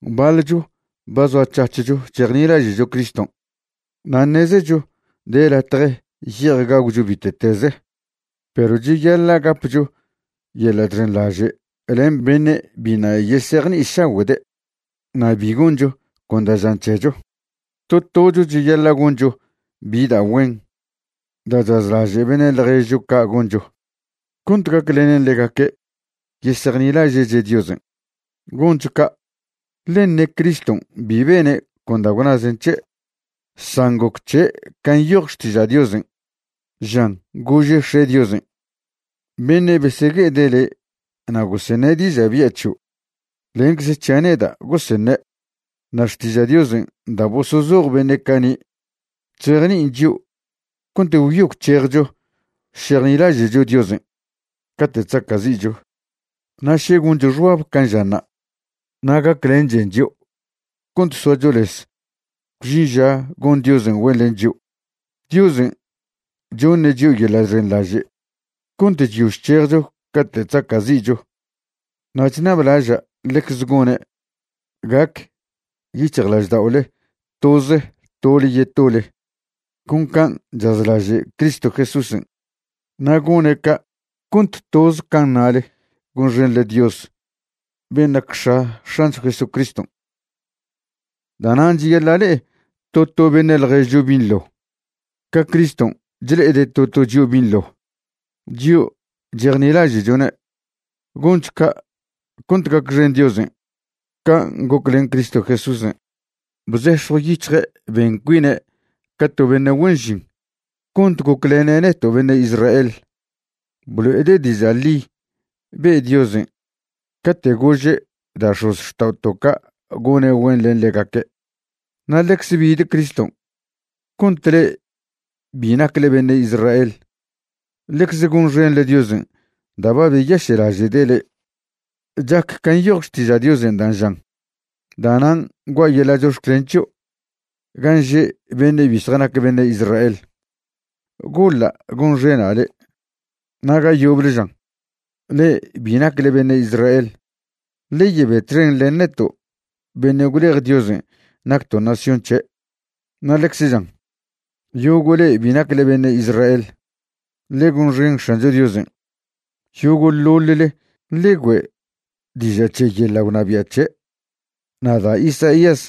Baḻcho ba zoac̱hac̱hcho chejnilaže'cho Criston' na' ṉezecho de latje ye'ej gagwcho bite'teze. Perw cheyaḻa' gapcho yeḻa' chxenḻaže' len beṉe' biṉa' yesejni'išagüe'de', na' bi goncho con da' žan c̱hecho. To tocho cheyaḻa' goncho bi da' güen da' chazlaže' beṉe' ḻježcho ca' goncho, cont gaclenen ḻegaque' yesejnilaže'che' Diosen'. Goncho ca', ḻe ṉe Criston' bi bene' con da' gwnazen c̱he', san goc c̱he' can' nyoj Xtiža' Diosen', žan gože' X̱e' Diosen': “Beṉe' besegue'ede' le' na' goseṉe' diža' bya' c̱hio', lencze c̱hia' neda' goseṉe'.” Na' Xtiža' Diosen' da' bosozoj beṉe' cani' chzejni'in chio' cont gwyo gwc̱hejcho šejnilaže'cho Diosen' cate' chzaca'zi'cho. Na' še goncho xbab can' žanṉa', na' gaclenchen chio' cont soacho lez gwžin ža gon Diosen' güen len chio'. Diosen' choṉe' chio' yeḻa' chxenḻaže' cont chyo chc̱hejcho cate' chzaca'zi'cho. Na' chṉablaža' ḻecze gone' gac yic̱hjlažda'ole toze tole yetole, con can' chazlaže' Cristo Jesúsen'. Na' gone' ca' cont toze can' ṉale gonxenḻe Dios ben' nac X̱a X̱ancho Jesucriston'. Da'nan' cheyaḻa' le'e to to beṉe' ḻježcho binḻo ca Criston' chle'ede' to to chio' binḻo, chio' chejnilaže'chone'. Goncho ca' cont gacxen Diosen'. Can' goc len Cristo Jesúsen', bzex̱jw yic̱hje' ben cuine' ca to beṉe' güen žin cont goclene' neto' beṉe' Israel. Blo'ede' diža' ḻi be' Diosen' cate' gože' da' x̱ozxta'oto' ca' gone' güen len ḻegaque'. Na' ḻecze bid Criston' cont le'e bi nacle beṉe' Israel ḻecze gonxenḻe Diosen' da' ba beyaše'laže'de' le'e. Chac ca nyoj Xtiža' Diosen' dan' žan: Da'nan' gua' yeḻa' chox̱clen c̱hio' gan' že beṉe' bi zjanac beṉe' Israel, goḻa' gonxena' le'. Na' ga yoble žan: Le'e bi nacle beṉe' Israel, ḻe yebe txen len neto' beṉe' gwlej Diosen' nacto' nación c̱he'. Na' ḻecze žan: Yogo' le'e bi nacle beṉe' Israel, ḻe gonxen X̱ancho Diosen'. Yogo'ḻoḻle ḻe güe' diža' c̱he yeḻa' gwnabia' c̱he'. Na' da' Isaías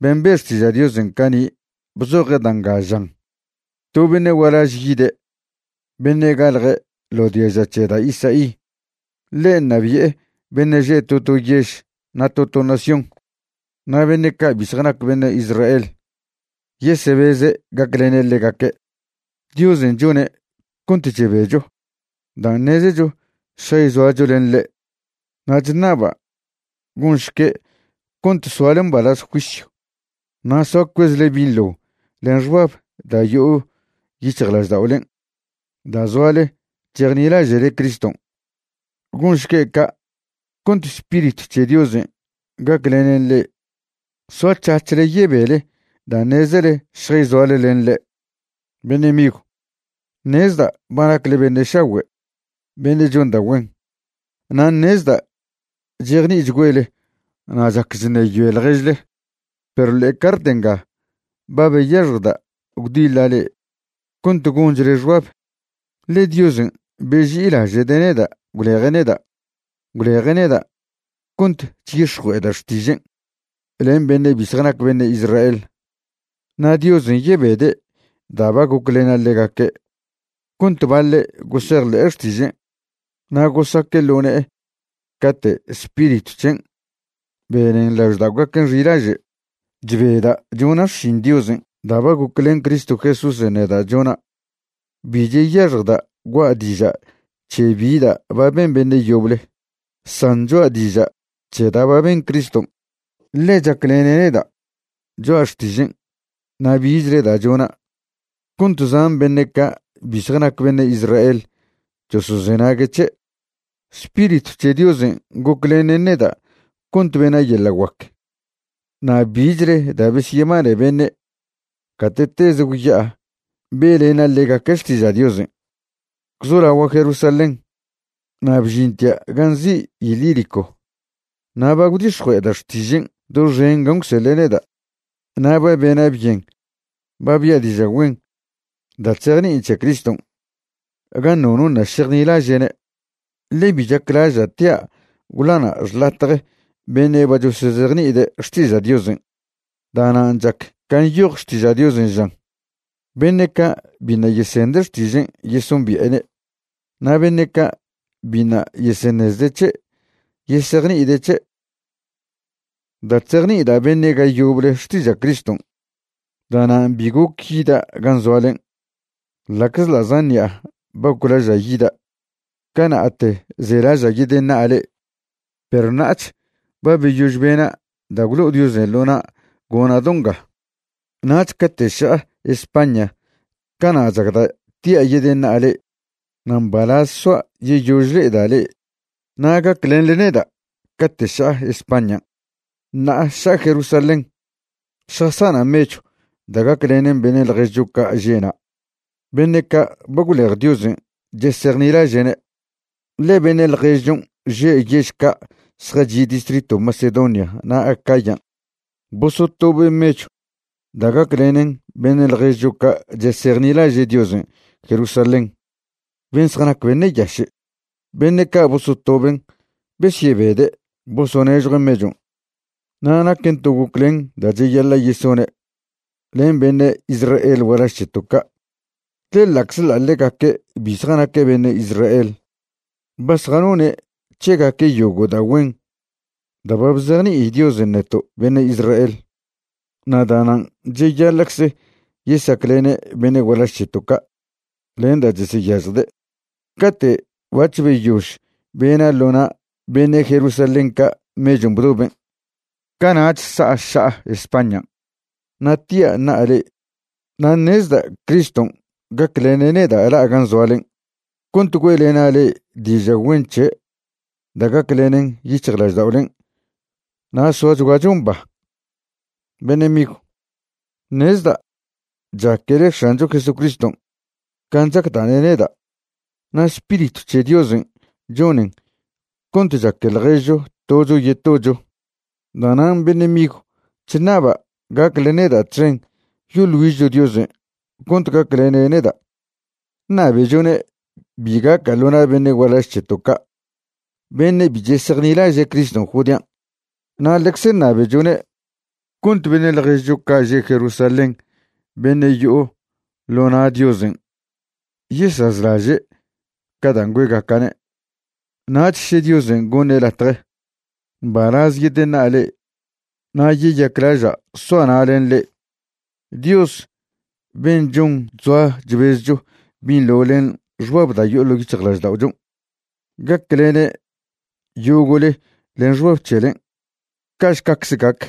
ben' be' xtiža' Diosen' cani' bzoje' da' nga žan: To beṉe' gualaž yide', beṉe' galje' ḻo diaža c̱he da' Isaí. Ḻe' ṉabi'e beṉe' že' to to yež na' to to nación, na' beṉe' ca' bi zjanac beṉe' Israel yesebeze' gaclene' ḻegaque'. Diosen' chone' cont chebecho dan' ṉezecho šjayzoacho len ḻe'. Na' chṉaba' gonšque' cont soale mbalaz juisyw na' soa cuezle binḻo len xbab da' yo'o yic̱hjlažda'olen' da' zoale chejnilaže'le Criston'. Gonšque' ca' cont Spiritw c̱he Diosen' gaclenen le'e soac̱hac̱hle yebele da' ṉezele šjayzoale len ḻe'. Beṉe' migw, ṉezda' ba nacle beṉe' šagüe' beṉe' chon da' güen, na' ṉezda' chejni'ichgüele na' chac chṉeyoe ḻježle. Pero ḻe'e cart nga ba beyaxjda' gwdiḻa' le'e cont gonchle xbab, ḻe Diosen' beži'ilaže'de' neda' gwleje' neda'. Gwleje' neda' cont chyix̱jue'eda' xtižen' len beṉe' bi zjanac beṉe' Israel. Na' Diosen' yebede' da' ba goclena' ḻegaque' cont baḻe' gosejḻe'e xtižen' na' gosaque' ḻo ne'e cate' Spiritw c̱hen' benen lažda'ogaquen' xilaže'. Chbeda' chona' xšin Diosen' da' ba goclen Cristo Jesúsen' neda' chona'. Bi cheyaxjda' gua' diža' c̱he bi da' ba ben beṉe' yoble, san choa' diža' c̱he da' ba ben Criston', ḻe chaclene' neda' choa' xtižen' na' bichle da' chona' cont zan beṉe' ca' bi zjanac beṉe' Israel chosozenague' c̱he'. Spiritw c̱he Diosen' goclenen neda' cont bena' yeḻa' guac na' bichle da' besyebane beṉe' gate'teze gwya'a be'lena' ḻegaque' xtiža' Diosen', gwzolagua' Jerusalén na' bžintia' gan' nzi' Ilírico. Na' ba gwdix̱jue'eda' xtižen' doxen gan' gwseḻe' neda'. Na' ba bena' byen ba bia' diža' güen da' chzejni'in c̱he Criston' gan' nono ṉa' šejnilaže'ne', ḻe bi chaclaža' tia' gwḻana' xḻatje beṉe' ba chosozejni'ide' xtiža' Diosen'. Da'nan' chac can' nyoj Xtiža' Diosen' žan: Beṉe' ca' biṉa' yesende' xtižen' yesombi'ene', na' beṉe' ca' biṉa' yeseṉezde' c̱he' yesejni'ide' c̱he'. Da' chzejni'ida' beṉe' ga yoble xtiža' Criston', da'nan' bi goc yida' gan' zoalen' ḻa'czḻa' zan ṉi'a ba goclaža' yida'. Cana'te zelaža' yedeṉa'a le'e, perw ṉa'ach ba beyož bena' da' gwlo'o Diosen' ḻo na' gona' do nga. Nach cate' ša'a España cana' chacda' tia' yedeṉa'a le'e. Na' mbalaz soa' yeyož le'eda' le'e na' gaclenḻe neda' cate' ša'a Españan'. Ṉa'a ša'a Jerusalén šjasana' mechw da' gaclenen beṉe' ḻježcho ca' že' na' beṉe' ca' ba gwlej Diosen' chesejnilaže'ne'. Ḻe beṉe' ḻježchon' že' yež ca' zjachi' distritw Macedonia na' Acayan' bosotobe' mechw da' gaclenen beṉe' ḻježcho ca' chesejnilaže' Diosen' Jerusalén ben' zjanac beṉe' yaše'. Beṉe' ca' bosotoben' besyebede' bosonežjue' mechon', na' naquen to goclen da' cheyaḻa' yesone' len beṉe' Israel gualaž c̱heto' ca', ḻe ḻa'czḻa' ḻegaque' bi zjanaque' beṉe' Israel, ba zjanone' c̱hegaque' yogo' da' güen da' ba bzejni'i Diosen' neto' beṉe' Israel, na' da'nan' cheyaḻa'cze yesaclene' beṉe' gualaž c̱heto' ca' len da' cheseyažjde'. Cate' bac̱h beyož bena' ḻo na' beṉe' Jerusalén ca' mechon' bdoben', cana'ch sa'a ša'a Españan' na' tia' ṉa'a le'e. Na' ṉezda' Criston' gaclene' neda' la'a gan' zoalen' cont güe'lena' le'e diža' güen c̱he' da' gaclenen yic̱hjlažda'olen' na' soachguacho mba. Beṉe' migw, ṉezda' chaquele X̱ancho Jesucriston' can' chacda'ne' neda', na' Spiritw c̱he Diosen' chonen cont chaque ḻježcho tocho yetocho. Da'nan', beṉe' migw, chṉaba' gacle neda' txen yoḻ güižcho Diosen' cont gaclene' neda'. Ṉabechone' bi gaca' ḻo na' beṉe' gualaž c̱heto' ca' beṉe' bi chesejnilaže' Criston' Judean', na' ḻecze ṉabechone' cont beṉe' ḻježcho ca' že' Jerusalén beṉe' yo'o ḻo na' Diosen' yesazlaže' ca dan' güe'gaca'ne'. Nach še Diosen' goṉe' latje, mbalaz yedeṉa'a le'e na' yeyaclaža' soa' na' len le'e. Dios ben' chon chzoa chbezcho binḻo len xbab da' yo'o ḻo' yic̱hjlažda'ochon' gaclene' yogo'le len xbab c̱helen'. Ca'šcacze gac.